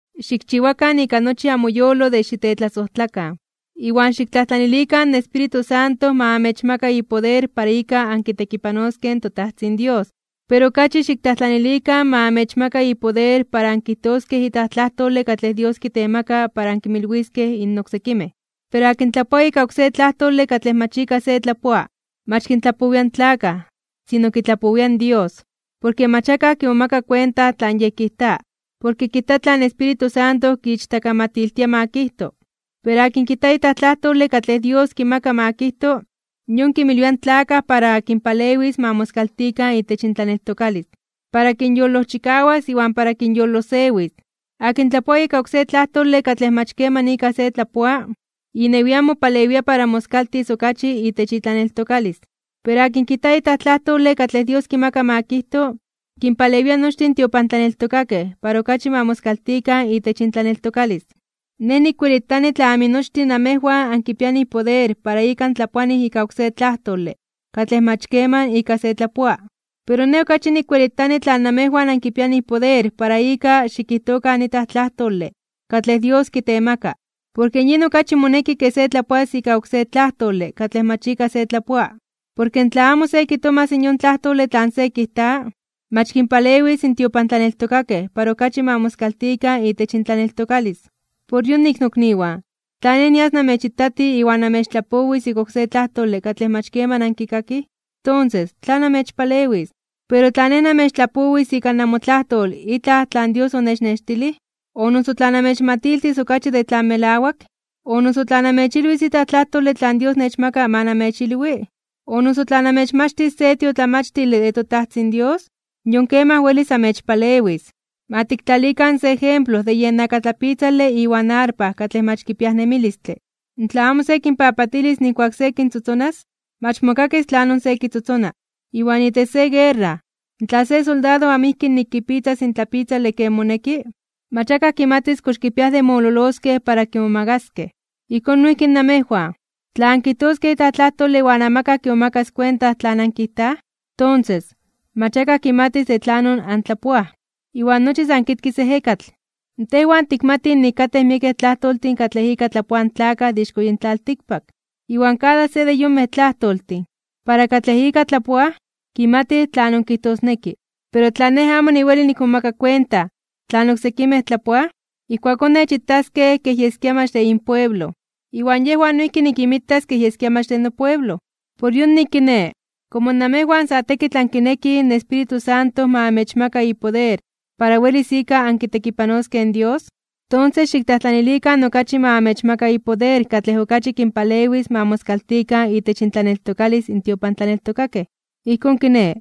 Xikchiwakan ika nochi amoyolo de xitetlasojtlakan, iwan xiktlajtlanilikan in Espíritu Santo ma amechmaka ipoder para ika ankitekipanoskej in toTajtzin Dios. Pero okachi xiktlajtlanilikan ma amechmaka ipoder para ankijtoskej itlaj tlajtole katlej Dios kitemaka para ankinmilwiskej in oksekimej. Porke akin tlapoa ika oksé tlajtole katlej mach ika se tlapoa, mach kintlapowia in tlakaj, sino kitlapowia in Dios, porke mach akaj kimomaka kuenta tlan yej kijta. Porke kijta tlan Espíritu Santo kiichtakamatiltia ma kijto. Pero akin kijta itlaj tlajtole katlej Dios kimaka ma kijto, yon kinmilwia in tlakaj para kinpalewis ma moskaltikan itech intlaneltokalis, para kinyolojchikawas iwan para kinyolosewis. Akin tlapoa ika oksé tlajtole katlej mach keman ika se tlapoa, inewian mopalewia para moskaltis okachi itech itlaneltokalis. Pero akin kijta itlaj tlajtole katlej Dios kimaka ma kijto, kinpalewia nochtin in tiopantlaneltokakej para okachi ma moskaltikan itech intlaneltokalis. Nej nikwelitani tla aminochtin namejwan ankipianij poder para ika antlapoanij ika oksé tlajtole katlej mach keman ika se tlapoa, pero nej okachi nikwelitani tla namejwan ankipianij poder para ika xikijtokan itlaj tlajtole katlej Dios kitemaka. Porke yin okachi moneki ke se tlapoas ika oksé tlajtole katlej mach ika se tlapoa. Porke tla amo se kitomas yon tlajtole tlan se kijta, mach kinpalewis in tiopantlaneltokakej para okachi ma moskaltikan itech intlaneltokalis. Por yonik, nokniwan, tla nej nias namechitati iwan namechtlapowis ika oksé tlajtole katlej mach keman ankikakij, tonses, ¿tlan amechpalewis? Pero tla nej namechtlapowis ika namotlajtol itlaj tlan Dios onechnextilij, o noso tla namechmatiltis okachi de tlan melawak, o noso tla namechilwis itlaj tlajtole tlan Dios nechmaka ma namechilwi, o noso tla namechmachtis se tiotlamachtile de toTajtzin Dios, yon kemaj welis amechpalewis. Ma tiktlalikan se ejemplo de yen akatlapitzale iwan arpa katlej mach kipiaj nemilistle. Tla amo se kinpapatilis nijkuak se kintzotzonas, mach mokakis tlanon se kitzotzona. Iwan itech se guerra, tla se soldado amo ijki nik kipitzas in tlapitzale ken moneki, mach akaj kimatis kox kipiaj de mololoskej para kimomagaskej. Ijkón noijki namejwan. Tla ankijtoskej itlaj tlajtole iwan amakaj kimomakas kuenta tlan ankijtaj, tonses, mach akaj kimatis de tlanon antlapoaj. Iwan nochi san kitkis in ejekatl. Tejwan tikmatij nik katej miekej tlajtoltin katlej ika tlapoaj in tlakaj de ixko yin tlaltikpak, iwan kada se de yonmej tlajtoltin, para katlej ika tlapoaj, kimatij tlanon kijtosneki. Pero tla nej amo weli nikmomaka kuenta tlan oksekimej tlapoaj, ijkuakón nej nechitaskej kej yeskia mach de inpueblo, iwan yejwan noijki nikinmitas kej yeskia mach de nopueblo. Por yonik kiné, komo namejwan sa tekitl ankinekij in Espíritu Santo ma amechmaka ipoder para welis ika ankitekipanoskej in Dios, tonses xiktlajtlanilikan okachi ma amechmaka ipoder katlej okachi kinpalewis ma moskaltikan itech intlaneltokalis in tiopantlaneltokakej. Ijkón kiné,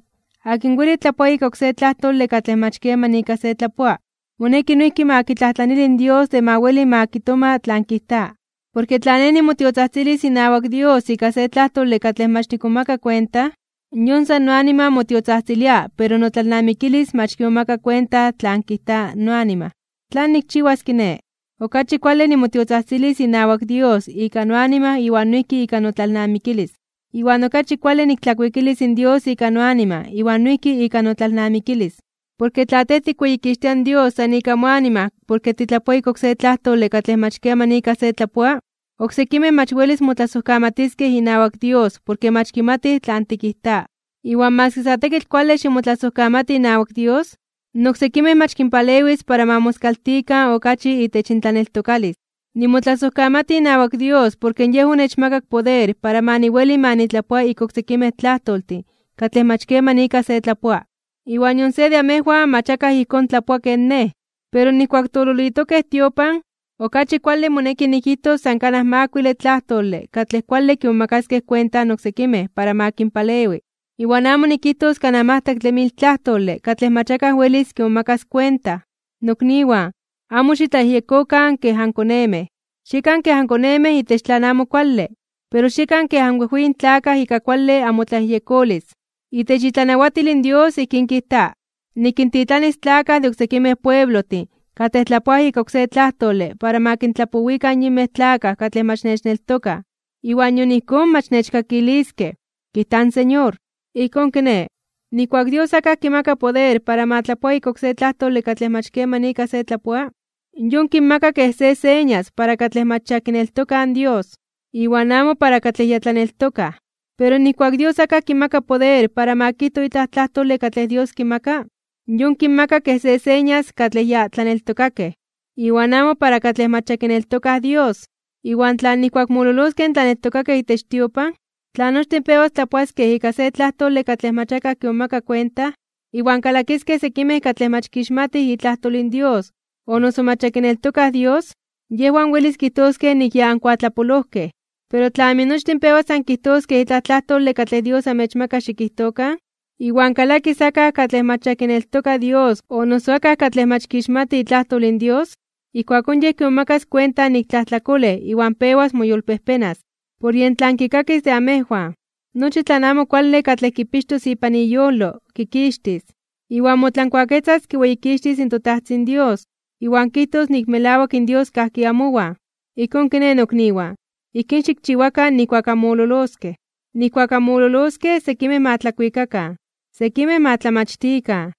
akin weli tlapoa ika oksé tlajtole katlej mach keman ika se tlapoa, moneki noijki ma kitlajtlanili in Dios de ma weli ma kitoma tlan kijta. Porke tla nej nimotiotzajtzilis inawak Dios ika se tlajtole katlej mach nikmomaka kuenta, yon san noanima motiotzajtzilia pero notlalnamikilis mach kimomaka kuenta tlan kijta noanima. ¿Tlan nikchiwas kiné? Okachi kuale nimotiotzajtzilis inawak Dios ika noanima iwan noijki ika notlalnamikilis. Iwan okachi kuale niktlakuikilis in Dios ika noanima iwan noijki ika notlalnamikilis. Porke tla tej tikweyikixtia in Dios san ika moanima porke titlapoa ika oksé tlajtole katlej mach keman ika se tlapoa, oksekimej mach welis motlasojkamatiskej inawak Dios porke mach kimatij tlan tikijta. Iwan maski sa tekitl kuale ximotlasojkamati inawak Dios, in oksekimej mach kinpalewis para ma moskaltikan okachi itech intlaneltokalis. Nimotlasojkamati inawak Dios porke Yej onechmakak poder para ma niweli ma nitlapoa ika oksekimej tlajtoltin katlej mach keman ika se tlapoa, iwan nion se de amejwan mach akaj ijkón tlapoa ken nej. Pero nijkuak tololitokej tiopan, okachi kuale moneki nikijtos san kanaj makuile tlajtole katlej kuale kimomakaskej kuenta in oksekimej para ma kinpalewi, iwan amo nikijtos kanaj majtlaktle mil tlajtole katlej mach akaj welis kimomakas kuenta. Nokniwan, amo xitlayejyekokan kej ankonemej. Xiekan kej ankonemej itech tlan amo kuale, pero xiekan kej anwejweyin tlakaj ika kuale amotlayejyekolis. Itech itlanawatil in Dios ijkín kijta: “Nikintitlanis tlakaj de oksekimej pueblojtin katlej tlapoaj ika oksé tlajtole para ma kintlapowikan yinmej tlakaj katlej mach nechneltokaj, iwan nion ijkón mach nechkakiliskej, kijta in Señor.” Ijkón kiné, nijkuak Dios akaj kimaka poder para ma tlapoa ika oksé tlajtole katlej mach keman ika se tlapoa, yon kinmaka kej se señas para katlej mach ya kineltokaj Dios, iwan amo para katlej ya tlaneltokaj. Pero nijkuak Dios akaj kimaka poder para ma kijto itlaj tlajtole katlej Dios kimaka, yon kinmaka kej se señas katlej ya tlaneltokakej, iwan amo para katlej mach ya kineltokaj Dios. Iwan tla nijkuak mololoskej in tlaneltokakej itech tiopan, tla nochtin pewas tlapoaskej ika se tlajtole katlej mach akaj kimomaka kuenta, iwan kalakiskej sekimej katlej mach kixmatij itlajtol in Dios o noso mach ya kineltokaj Dios, yejwan welis kijtoskej nik ya ankuatlapolojkej. Pero tla aminochtin pewas ankijtoskej itlaj tlajtole katlej Dios amechmaka xikijtokan, iwan kalakis akaj katlej mach ya kineltoka Dios o noso akaj katlej mach kixmati itlajtol in Dios, ijkuakón yej kimomakas kuenta nik tlajtlakolej iwan pewas moyolpejpenas (moyolkuepas), por yen tlan kikakis de amejwan. Nochi tlan amo kuale katlej kipixtos ipan iyolo, kikixtis. Iwan motlankuaketzas kiweyikixtis in toTajtzin Dios, iwan kijtos nik melawak in Dios kajki amowan. Ijkón kiné, nokniwan, ijkín xikchiwakan nijkuak anmololoskej. Nijkuak anmololoskej sekimej ma tlakuikakan, sekimej ma tlamachtikan,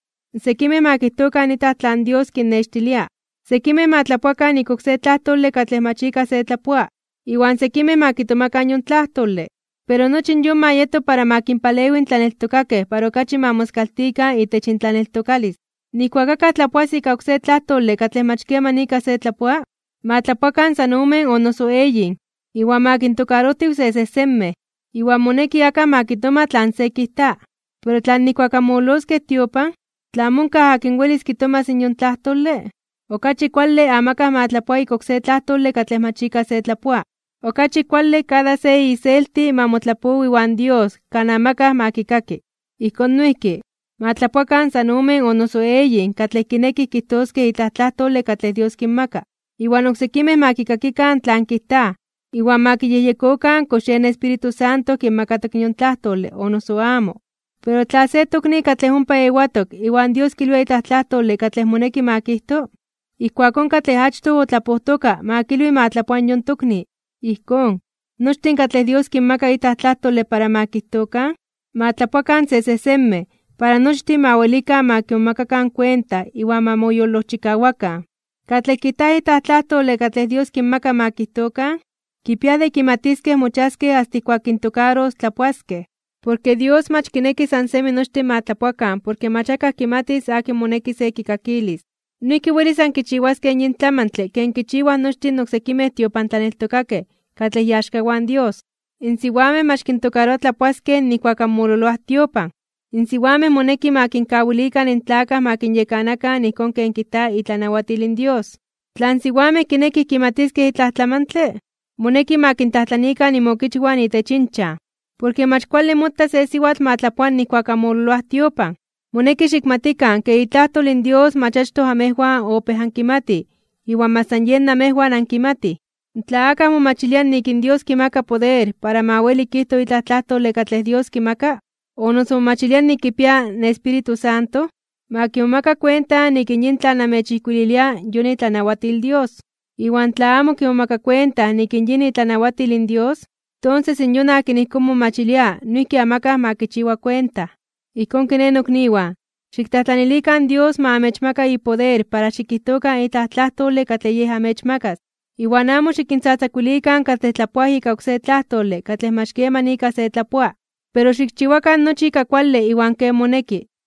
sekimej ma kijtokan itlaj tlan Dios kinnextilia, sekimej ma tlapoakan ika oské tlajtole katlej mach ika se tlapoa, iwan sekimej ma kitomakan yon tlajtole. Pero nochi yon ma yeto para ma kinpalewi in tlaneltokakej para okachi ma moskaltikan itech intlaneltokalis. Nijkuak akaj tlapoas ika oksé tlajtole katlej mach keman ika se tlapoa, ma tlapoakan san omen o noso eyin, iwan ma kintokarojtiw sesejsenmej. Iwan moneki akaj ma kitoma tlan se kijta. Pero tla nijkuak anmololoskej tiopan, tla amo onkaj akin welis kitomas in yon tlajtole, okachi kuale amakaj ma tlapoa ika oksé tlajtole katlej mach ika se tlapoa, okachi kuale kada se iselti ma motlapowi iwan Dios kan amakaj ma kikaki. Ijkón noijki, ma tlapoakan san omen o noso eyin katlej kinekij kijtoskej itlaj tlajtole katlej Dios kinmaka. Iwan oksekimej ma kikakikan tlan kijtaj, iwan ma kiyejyekokan kox yen Espíritu Santo kinmakatok in yon tlajtole o noso amo. Pero tla se tokni katlej ompa ewatok iwan Dios kilwia itlaj tlajtole katlej moneki ma kijto, ijkuakón katlej achtoj otlapojtoka ma kawili ma tlapoa yon tokni. Ijkón, nochtin katlej Dios kinmaka itlaj tlajtole para ma kijtokan, ma tlapoakan sesejsenmej para nochtin ma welikan ma kimomakakan kuenta iwan ma moyolojchikawakan. Katlej kijtaj itlaj tlajtole katlej Dios kinmaka ma kijtokan, kipiaj de kimatiskej mochiaskej asta ijkuak kintokaros tlapoaskej. Porke Dios mach kineki san semi nochtin ma tlapoakan porke mach akaj kimatis akin moneki se kikakilis. Noijki welis ankichiwaskej yin tlamantle ken kichiwaj nochtin in oksekimej tiopantlaneltokakej katlej iaxkawan in Dios. In siwamej mach kintokaroa tlapoaskej nijkuak anmololoaj tiopan. In siwamej moneki ma kinkawilikan in tlakaj ma kinyekanakan ijkón ken kijta itlanawatil in Dios. Tla in siwamej kinekij kimatiskej itlaj tlamantle, moneki ma kintlajtlanikan inmokichwan itech inchan. Porke mach kuale mota se siwatl ma tlapoa nijkuak anmololoaj tiopan. Moneki xikmatikan ke itlajtol in Dios mach achtoj amejwan opéj ankimatij iwan mach san yen namejwan ankimatij. Tla akaj momachilia nik in Dios kimaka poder para ma weli kijto itlaj tlajtole katlej Dios kimaka, o noso momachilia nik kipia in Espíritu Santo, ma kimomaka kuenta nik in yin tlan namechijkuililia yon itlanawatil in Dios. Iwan tla amo kimomaka kuenta nik yin itlanawatil in Dios, tonses yon akin ijkón momachilia noijki amakaj ma kichiwa kuenta. Ijkón kiné, nokniwan, xiktlajtlanilikan in Dios ma amechmaka ipoder para xikijtokan itlaj tlajtole katlej Yej amechmakas, iwan amo xikintzatzakuilikan katlej tlapoaj ika oksé tlajtole katlej mach keman ika se tlapoa. Pero xikchiwakan nochi ika kuale iwan ken moneki.